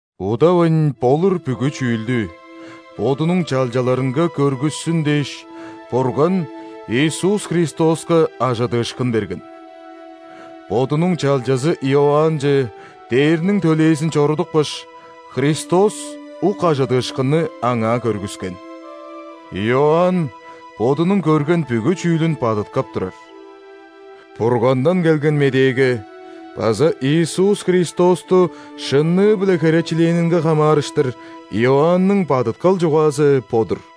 Удавайн болур бүгү чүүлдү Бодунуң чалчаларынга көргүссүн дээш, Бурган Иисус Христоска ·ажыдыышкын берген. Бодунуң чалчазы Иоаннче ·дээрниң төлээзин чорудупкаш, Христос ук ажыдыышкынны аңаа көргүскен. Иоанн бодунуң көрген бүгү чүүлүн бадыткап турар. Бургандан келген медээге база Иисус Христосту шынныы-биле херечилээнинге хамаарыштыр Иоанның бадыткал чугаазы бо-дур.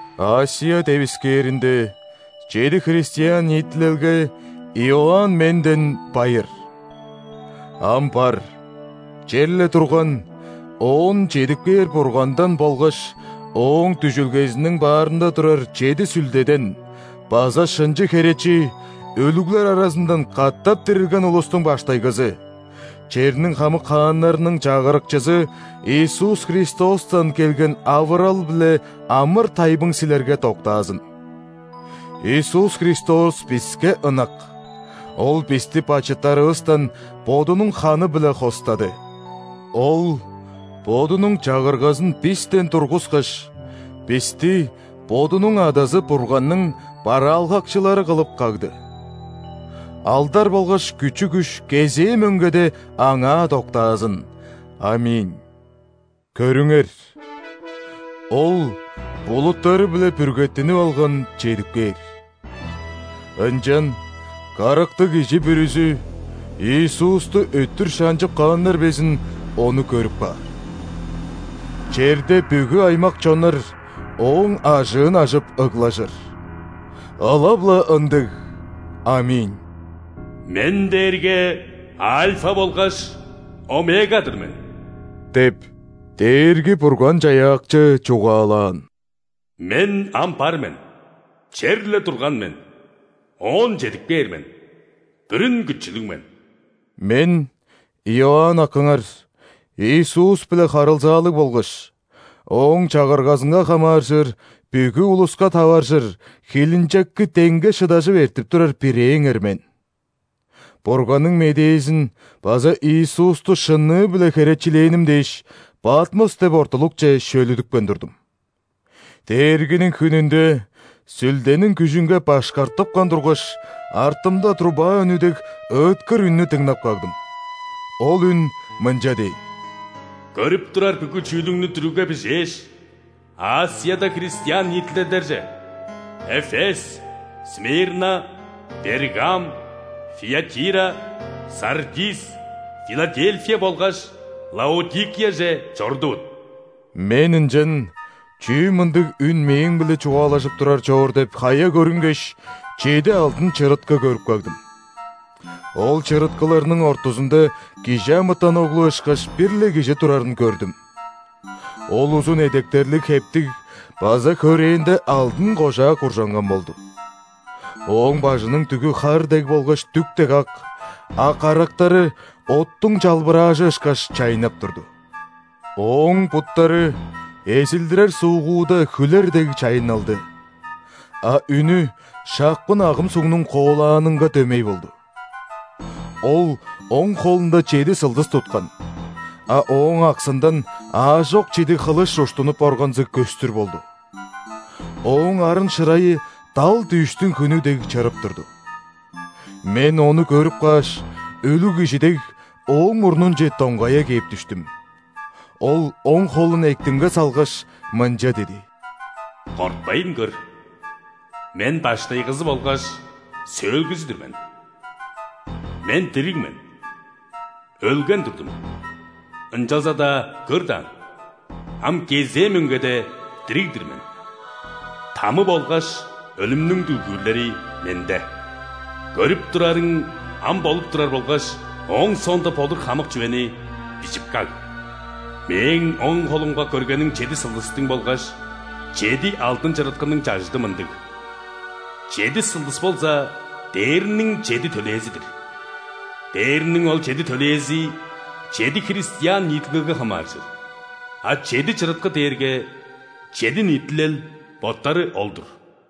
·Асия девискээринде чеди христиан ниитилелге Иоанн менден байыр. Ам бар, черле турган, оон чедип кээр Бургандан болгаш Ооң дүжүлгезиниң баарында турар чеди сүлдеден база шынчы Херечи, өлүглер аразындан катап дирилген улустуң баштайгызы, черниң хамык хааннарының Чагырыкчызы Иисус Христостан келген авырал биле амыр-тайбың силерге доктаазын. Иисус Христос биске ынак, Ол бисти бачыттарывыстан Бодунуң ханы-биле хостады. Ол Бодунуң Чагыргазын бистен тургускаш, бисти Бодунуң Адазы Бурганның бараалгакчылары кылып кагды. Алдар болгаш күчү-күш кезээ мөңгеде Аңаа доктаазын! ·Аминь! Көрүңер, Ол булуттары-биле бүргеттинип алган чедип кээр. Ынчан карактыг кижи бүрүзү, Иисусту өттүр шанчып кааннар безин, Ону көрүп каар. Черде бүгү аймак-чоннар Ооң ажыын ажып ыглажыр. Ылап-ла ындыг, аминь! «Мен дээрге Альфа болгаш Омега-дыр мен – деп, Дээрги-Бурган-Чаяакчы чугаалаан. – Мен ам бар мен, черле турган мен, оон чедип кээр мен, Бүрүн Күчүлүг мен». Мен – Иоанн акыңар, Иисус-биле харылзаалыг болгаш, Ооң Чагыргазынга хамааржыр бүгү улуска таваржыр хилинчекти деңге шыдажып эртип турар бирээңер мен. Бурганның медээзин база Иисусту шынныы-биле херечилээним дээш, Патмос деп ортулукче шөлүдүпкен турдум. Дээргиниң хүнүнде Сүлдениң күжүнге башкартыпкан тургаш, артымда труба үнү дег ыыткыр үннү дыңнап кагдым. Ол үн мынча дээн: «Көрүп турар бүгү чүүлүңнү дүрүгге бижээш, ·Асияда христиан ниитилелдерже: Эфес, Смирна, Пергам, Фиатира, Сардис, Филадельфия болгаш Лаодикияже чорудувут». Мен ынчан чүү мындыг үн мээң-биле чугаалажып турар чоор деп, хая көрүнгеш, чеди алдын чырыткы көрүп кагдым. Ол чырыткыларның ортузунда ·кижи амытан оглу ышкаш бир-ле Кижи турарын көрдүм. Ол узун эдектерлиг хептиг база хөрээнде алдын кожаа куржанган болду. Ооң бажының дүгү хар дег болгаш дүк дег ак, а карактары оттуң чалбыраажы ышкаш чайнап турду. Ооң буттары эзилдирер суугуда хүлер дег чайынналды, а үнү шапкын агым сугнуң коолаанынга дөмей болду. Ол оң холунда чеди сылдыс туткан, а Ооң аксындан аажок чидиг хылыш уштунуп органзыг көстүр болду. Ооң арын-шырайы дал дүъштүң хүнү дег чырып турду. Мен Ону көрүп кааш, өлүг кижи дег, Ооң мурнунче доңгая кээп дүштүм. Ол оң холун эктимге салгаш, мынча диди: «Кортпайн көр, Мен Баштайгызы болгаш Сөөлгүзү-дүр мен. Мен дириг мен. Өлген турдум, ынчалза-даа көр даан: ам кезээ мөңгеде дириг-дир мен! Тамы болгаш өлүмнүң дүлгүүрлери – Менде. Көрүп турарың, ам болуп турар болгаш ооң соонда болур хамык чүвени бижип каг. Мээң оң холумга көргениң чеди сылдыстың болгаш чеди алдын чырыткының чажыды мындыг: чеди сылдыс болза дээрниң чеди төлээзи-дир. Дээрниң ол чеди төлээзи чеди христиан ниитилелге хамааржыр, а чеди чырыткы дээрге чеди ниитилел боттары ол-дур».